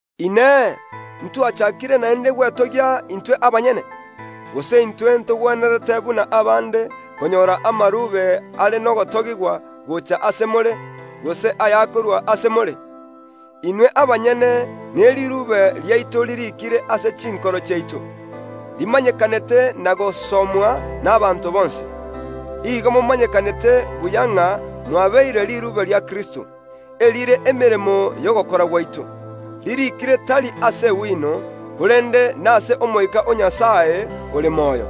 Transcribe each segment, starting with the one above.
Inee! Ntwachakire naende gwetogia intwe abanyene? Gose intwe ntogwenerete, buna abande, konyora amarube are nogotogigwa gocha ase more, gose ayakorwa ase more? Inwe abanyene neriruube riaito ririikire ase chinkoro chiaito, rimanyekanete na gosomwa nabaanto bonsi. Igo momanyekanete buya ng’a mwabeire riruube ria Kristo, erire emeremo y’ogokora gwaito, ririikire tari ase egwino, korende nase Omoika o Nyasae ore moyo;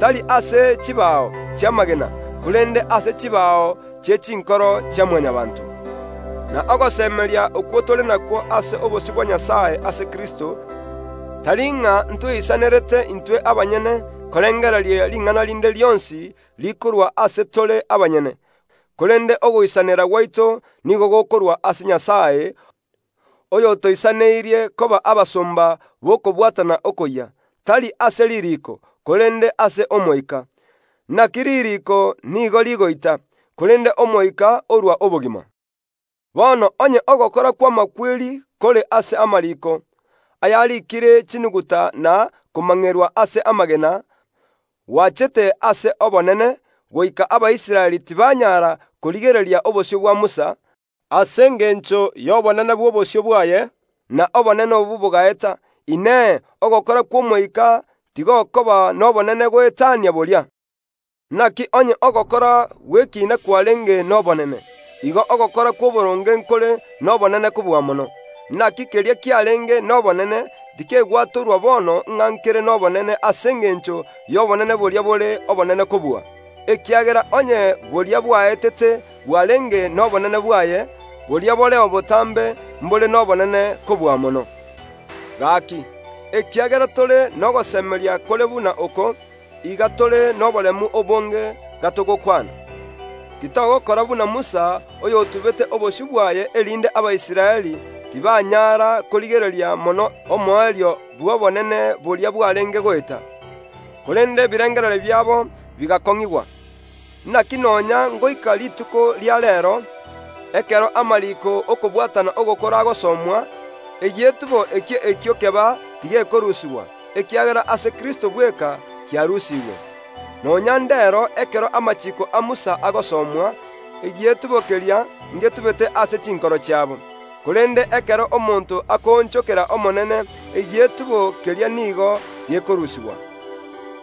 tari ase chibao chi’amagena, korende ase chibao chie chinkoro chia Mwanyabaanto. Okwo nakwo ogosemeria tore nakwo ase obosio bwa Nyasae ase Kristo; tari ng’a ntwoisanerete intwe abanyene korengereria ring’ana rinde rionsi rikorwa ase tore abanyene, korende ogoisanera gwaito nigo gokorwa ase Nyasae, oyotoisaneirie koba abasomba b’okobwatana okoyia; tari ase ririiko, korende ase Omoika. Naki ririiko nigo rigoita, korende Omoika orua obogima. Bono onye ogokora kw’amakweri kore ase amariiko, ayariikire chinuguta na komang’erwa ase amagena, gwachete ase obonene, goika Abaisraeli tibanyara korigereria obosio bwa Musa, ase engencho y’obonene bw’obosio bwaye; na obonene obwo bogaeta, Inee, ogokora kw’Omoika tigokoba nobonene goetania boria? Naki onye ogokora gw’ekiina kwarenge nobonene, igo ogokora kw’oboronge nkore nobonene kobua mono. Naki keria kiarenge nobonene tikegwatorwa bono ng’a nkere nobonene ase engencho y’obonene boria bore obonene kobua. Ekiagera onye boria bwaetete bwarenge nobonene bwaye, boria boreo botambe mbore nobonene kobua mono. Gaki, ekiagera tore nogosemeria kore buna oko, iga tore noboremu obonge gatogokwana. Titogokora buna Musa oyotubete obosio bwaye, erinde Abaisraeli tibanyara korigereria mono omoerio bw’obonene boria bwarenge goeta. Korende ebirengererio biabo bigakong’igwa. Naki nonya ngoika rituko ria reero, ekero amariiko y’okobwatana ogokoro agosomwa, egietubo ekio ekio keba tigekorusigwa, ekiagera ase Kristo bweka kiarusigwe. Nonya ndero ekero amachiiko a Musa agosomwa, egietubo keria ngetubete ase chinkoro chiabo. Korende ekero omonto akoonchokera Omonene egietubo keria nigo gekorusigwa.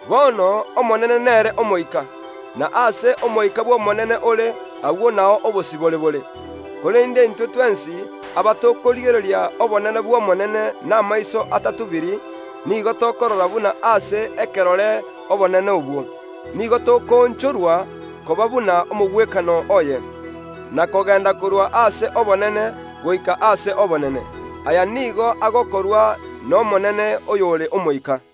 Bono Omonene nere Omoika; na aase Omoika bw’Omonene ore, agwo nao obosibore bore. Korende intwe twensi abatokorigereria obonene bw’Omonene namaiso atatubiri, nigo tokorora buna ase ekerore obonene obwo. Nigo tokoonchorwa koba buna omogwekano oye, na kogenda korwa ase obonene goika ase obonene. Aya nigo agokorwa n’Omonene oyore Omoika.